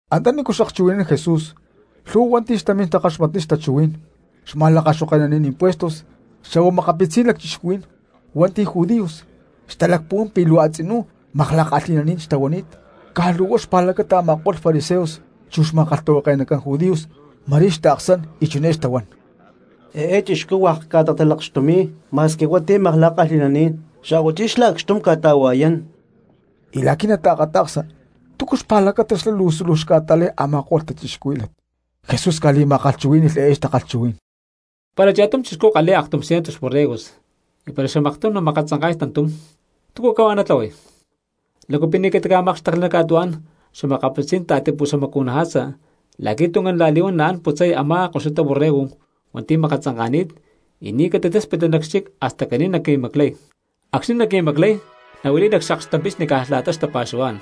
Antanícu xakchuhui̠nán Jesús lhu̠hua hua̠nti̠ xtamín takaxmatniy xtachuhuí̠n, xma̠lakaxoke̠naní̠n impuestos xa̠hua makapitzí̠n lacchixcuhuí̠n hua̠nti̠ judíos xtalacpuhuán pi̠ luu a̠tzinú makla̠kalhi̠naní̠n xtahuani̠t. Caj luu huá xpa̠lacata a̠ma̠ko̠lh fariseos chu xma̠kalhtahuake̠nacán judíos ma̠rí xtaaksán y chiné xtahuán: —Eé chixcú hua̠k ca̠ta̠talakxtumi̠y ma̠squi hua̠nti̠ makla̠kalhi̠naní̠n xa̠huachí xlá acxtum ca̠ta̠hua̠yán. Y la̠qui̠ nataakata̠ksa túcu xpa̠lacata xlá suluj xca̠ta̠lay a̠ma̠ko̠lh cristianos, Jesús ca̠li̠ma̠kalhchuhuí̠ni̠lh eé takalhchuhuí̠n: —Para cha̠tum chixcú kalhi̠y aktum ciento xborregos y para xamaktum namakatzanka̠y tantum, ¿túcu cahuá natlahuay? ¿Lácu pi̠ ni̠ catica̠mákxtekli nac ca̠tuhuá̠n xa̠makapitzí̠n ta̠tipuxamacu̠naja̠tza la̠qui̠ tuncán la̠li̠huán naán putzay a̠má koxutá borrego hua̠nti̠ makatzanka̠ni̠t y ni̠ catitáspitli nac xchic hasta caní namaclay? Acxni̠ naqui̠maclay, nahuili̠y nac xaklhtampixni caj la̠ta xtapa̠xuhuá̠n.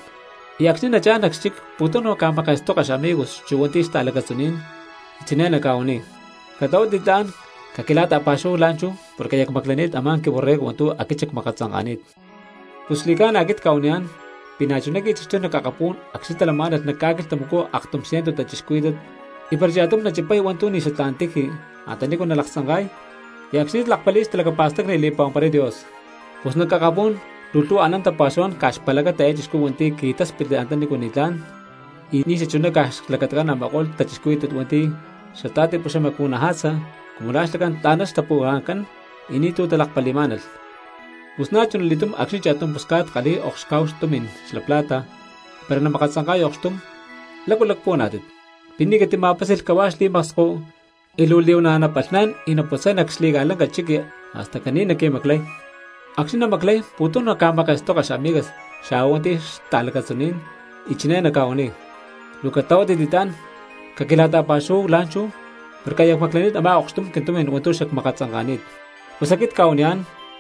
Y acxni̠ nachá̠n nac xchic pu̠tum naca̠ma̠ke̠stoka xamigos chu hua̠nti̠ xta̠lacatzuní̠n y chiné naca̠huaniy: “Catlahuátit li̠tlá̠n caquila̠ta̠pa̠xuhuáhu la̠nchú porque aya cmaclani̠t a̠má quiborrego hua̠ntu̠ aquit xacmakatzanka̠ni̠t.” Pus xli̠ca̠na aquit cca̠huaniyá̠n pi̠ na̠chuná qui̠taxtuy nac akapú̠n acxni̠ talamá̠nalh nac ca̠quilhtamacú aktum ciento cristianos, y para cha̠tum nachipay hua̠ntu̠ ni̠ xatlá̠n tiji antanícu nalaktzanka̠y, y acxni̠ lakpali̠y xtalacapa̠stacni y li̠pa̠huamparay Dios. Pus nac akapú̠n luu lhu̠hua anán tapa̠xuhuá̠n caj xpa̠lacata eé chixcú hua̠nti̠ qui̠táspitli antanícu ni̠tlá̠n y ni̠ xachuná caj xlacatacán a̠ma̠ko̠lh cristianos hua̠nti̠ xata̠tipuxamacu̠naja̠tza cumu xlacán tla̠na xtapuhua̠ncán y ni̠tu̠ talakpali̠má̠nalh. ’Pus na̠chuna li̠túm acxni̠ cha̠tum pusca̠t kalhi̠y okxcá̠hu tumi̠n xla plata y para namakatzanka̠y okxtum, ¿lácu lacpuhuaná̠tit? ¿Pi̠ ni̠ catima̠pási̠lh cahuá xli̠maksko y luu li̠huana̠ napalhnán y naputzay nac xli̠ca̠lanca chiqui hasta caní naqui̠maclay? Acxni̠ namaclay pu̠tum naca̠ma̠ke̠stoka xamigas xa̠hua hua̠nti̠ xta̠lacatzuní̠n, y chiné naca̠huaniy: “Luu catlahuátit li̠tlá̠n, caquila̠ta̠pa̠xuhuáhu la̠nchú porque aya cmaclani̠t a̠má okxtum quintumi̠n hua̠ntu̠ xacmakatzanka̠ni̠t.” Pus aquit cca̠huaniyá̠n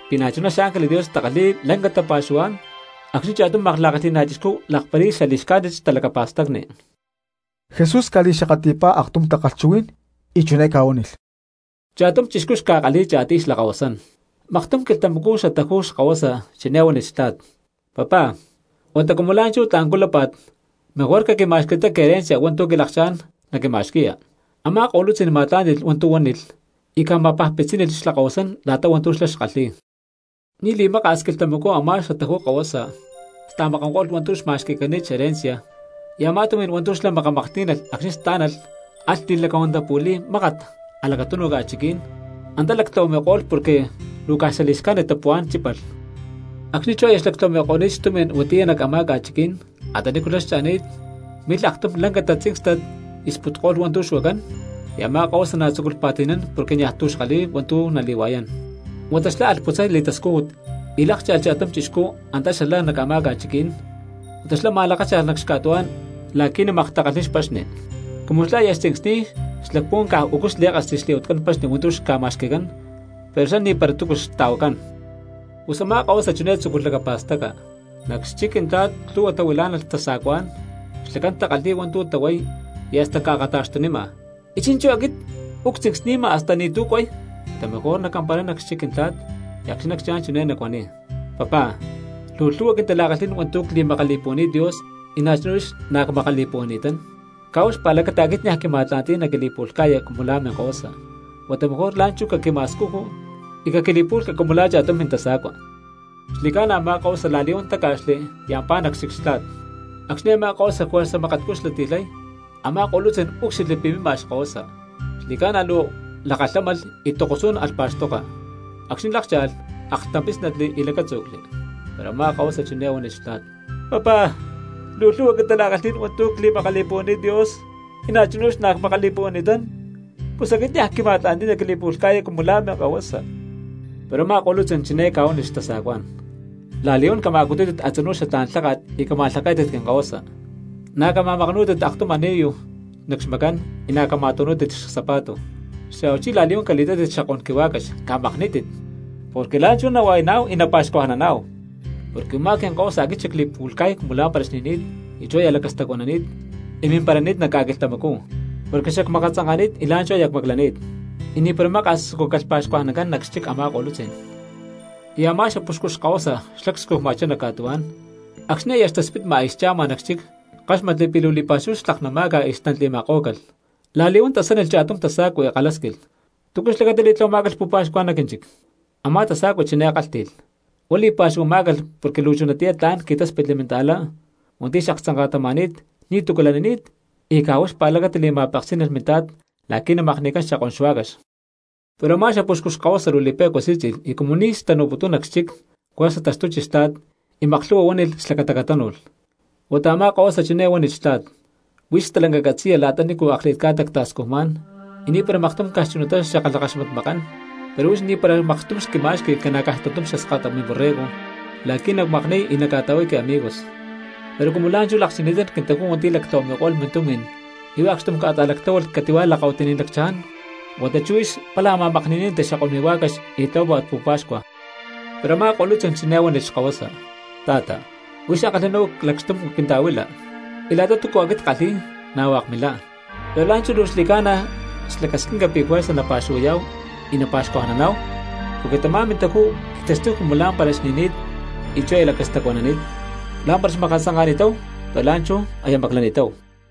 pi̠ na̠chuná xángeles Dios takalhi̠y aktum lanca tapa̠xuhuá̠n acxni̠ cha̠tum makla̠kalhi̠ná chixcú lakpali̠y xali̠xcájnit xtalacapa̠stacni. Jesús ca̠li̠xakatli̠pá aktum takalhchuhuí̠n y chiné ca̠huánilh: —Cha̠tum chixcú xca̠kalhi̠y cha̠tiy xlakahuasán. Maktum quilhtamacú xataju xkahuasa chiné huánilh xtla̠t: “Papá, huata cumu la̠nchú tla̠ncú lápa̠t, mejor caquima̠xquitá quiherencia hua̠ntu̠ quilakchá̠n naquima̠xqui̠ya.” Amá ko̠lutzí̠n ma̠tlá̠nti̠lh hua̠ntu̠ huánilh y ca̠ma̠pajpitzí̠nilh xlakahuasán la̠ta hua̠ntu̠ xlá xkalhi̠y. Ni̠ li̠maka̠s quilhtamacú a̠má xataju xkahuasa sta̠makankólh hua̠ntu̠ xma̠xqui̠cani̠t xherencia, y a̠má tumi̠n hua̠ntu̠ xlá makamaklhtí̠nalh acxni̠ stá̠nalh alh li̠lacahuantapu̠li̠y mákat nac a̠lacatúnuj ca̠chiquí̠n; antá lactlahuami̠ko̠lh porque luu caj xali̠xcájnit tapuhuá̠n chípalh. Acxni̠ aya xlactlahuami̠ko̠ni̠t xtumi̠n huatiyá nac a̠má ca̠chiquí̠n antanícu xlá xcha̠ni̠t milh aktum lanca tatzíncstat y sputko̠lh hua̠ntu̠ xuacán, y a̠má kahuasa na̠ tzúculh pa̠ti̠nán porque niaj tu̠ xkalhi̠y hua̠ntu̠ nali̠hua̠yán. Huata xlá alh putzay li̠tascújut y lákcha̠lh cha̠tum chixcú antá xalá nac a̠má ca̠chiquí̠n, huata xlá ma̠lakácha̠lh nac xca̠tuhuá̠n la̠qui̠ namaktakalhniy xpaxni. Cumu xlá aya xtzincsni̠y xlacpuhuán caj u̠cu xlí̠kasli xli̠huatcán paxni hua̠ntu̠ xca̠ma̠xqui̠cán, pero xlá ni̠para túcu xta̠huacán. Pus a̠má kahuasa chiné tzúculh lacapa̠staca: “Nac xchic quintla̠t lhu̠hua tahuilá̠nalh xtasa̠cuá̠n, xlacán takalhi̠y hua̠ntu̠ tahuay y hasta ca̠akata̠xtunima, ¡y chi̠nchú aquit uú ctzincstamakama hasta ni̠tu̠ cuay! Huata mejor nacamparay nac xchic quintla̠t, y acxni̠ nacchá̠n chiné nacuaniy: Papá, luu lhu̠hua quintala̠kalhí̠n hua̠ntu̠ cli̠makali̠puhuani̠t Dios y na̠chuná huix na̠ cmakali̠puhuani̠tán. Caj huá xpa̠lacata aquit niaj quima̠tla̠nti̠y naquili̠pu̠lhca̠ya cumu la̠ minkahuasa, huata mejor la̠nchú caquima̠scuju y caquili̠pu̠lhca cumu la̠ cha̠tum mintasa̠cua.” Xli̠ca̠na a̠má kahuasa la̠li̠huán táca̠xli y ampá nac xchic xtla̠t. ’Acxni̠ a̠má kahuasa juerza makatcú xlati̠lhay, a̠má ko̠lutzí̠n úcxilhli pi̠ mima xkahuasa. Xli̠ca̠na luu lakalhámalh y tokosú̠n alh pa̠xtoka; acxni̠ lákcha̠lh aklhtampí̠snatli y lacátzu̠cli. Pero a̠má kahuasa chiné huánilh xtla̠t: “Papá, luu lhu̠hua quintala̠kalhí̠n hua̠ntu̠ cli̠makali̠puhuani̠t Dios, y na̠chuná huix na̠ cmakali̠puhuani̠tán; pus aquit niaj quima̠tla̠nti̠y naquili̠pu̠lhca̠ya cumu la̠ minkahuasa.” Pero a̠má ko̠lutzí̠n chiné ca̠huánilh xtasa̠cuá̠n: “La̠li̠huán cama̠cutútit a̠tzinú xatlá̠n lháka̠t y cama̠lhaké̠tit quinkahuasa. Na̠ cama̠makanú̠tit aktum ani̠lu nac xmacán, y na̠ cama̠tu̠nú̠tit csapa̠tu. Xa̠huachí la̠li̠huán cali̠tátit xakón quihuá̠cax, camakní̠tit, ¡porque la̠nchú nahua̠yaná̠hu y napa̠xcuajnaná̠hu! Porque u̠má quinkahuasa aquit xacli̠pu̠lhca̠y cumu lá̠mpara xni̠ni̠t y chú aya lacastacuanani̠t, y mimparani̠t nac ca̠quilhtamacú; porque xacmakatzanka̠ni̠t y la̠nchú aya cmaclani̠t.” Y ni̠para maka̠s tzucúcalh pa̠xcuajnancán nac xchic a̠má ko̠lutzí̠n. ’Y a̠má xapuxcu xkahuasa xlá cscujma̠chá nac ca̠tuhuá̠n, acxni̠ aya xtaspitma y xcha̠ma nac xchic, káxmatli pi̠ luu li̠pa̠xúhu xtlaknama̠ca y xtantli̠ma̠kó̠calh. La̠li̠huán tasánilh cha̠tum tasa̠cua y kalhásquilh: “¿Túcu xlacata li̠tlahuamá̠calh pu̠pa̠xcua nac quínchic?” Amá tasacua chiné kálhti̠lh: “Huá li̠pa̠xcuajnamá̠calh porque luu chunatiyá tla̠n qui̠táspitli minta̠lá hua̠nti̠ xaktzanka̠tama̠ni̠t ni̠tu̠cu lanini̠t, y caj huá xpa̠lacata li̠ma̠peksí̠nalh mintla̠t la̠qui̠ namakni̠cán xakón xuá̠cax.” Pero a̠má xapuxcu xkahuasa luu li̠pe̠cua sí̠tzi̠lh y cumu ni̠ xtanu̠putún nac chiqui juerza taxtuchi xtla̠t y maklhu̠hua huánilh xlacata catánu̠lh. Huata a̠má kahuasa chiné huánilh xtla̠t: “Huix stalanca catzi̠ya la̠ta nícu akli̠t ca̠ta cta̠scujmá̠n, y ni̠para maktum caj chunatá xackalhakaxmatmakán, pero huix ni̠para maktum xquima̠xqui ca̠na caj tantum xaskata miborrego la̠qui̠ nacmakni̠y y nacca̠ta̠huay quiamigos. Pero cumu la̠nchú lakchini̠tán quintajú hua̠nti̠ lactlahuami̠ko̠lh mintumi̠n y huá acxtum ca̠ta̠lactláhualh cati̠hua̠ lakahuitiní̠n lacchaján huata chú huix pála ma̠makni̠ní̠nanti xakón mihuá̠cax y tlahuápa̠t pu̠pa̠xcua.” ’Pero a̠má ko̠lutzí̠n chiné huánilh xkahuasa: “Ta̠ta, huix ankalhi̠ná uú lacxtum quinta̠huila, y la̠ta túcua aquit ckalhi̠y na̠ hua̠k milá. Pero la̠nchú luu xli̠ca̠na xlacasquinca pi̠ juerza napa̠xuhuayá̠hu y napa̠xcuajnaná̠hu, porque tamá mintajú qui̠taxtuy cumu lá̠mpara xni̠ni̠t y chú aya lacastacuanani̠t; lá̠mpara xmakatzanka̠ni̠táhu pero la̠nchú aya maclani̠táhu.”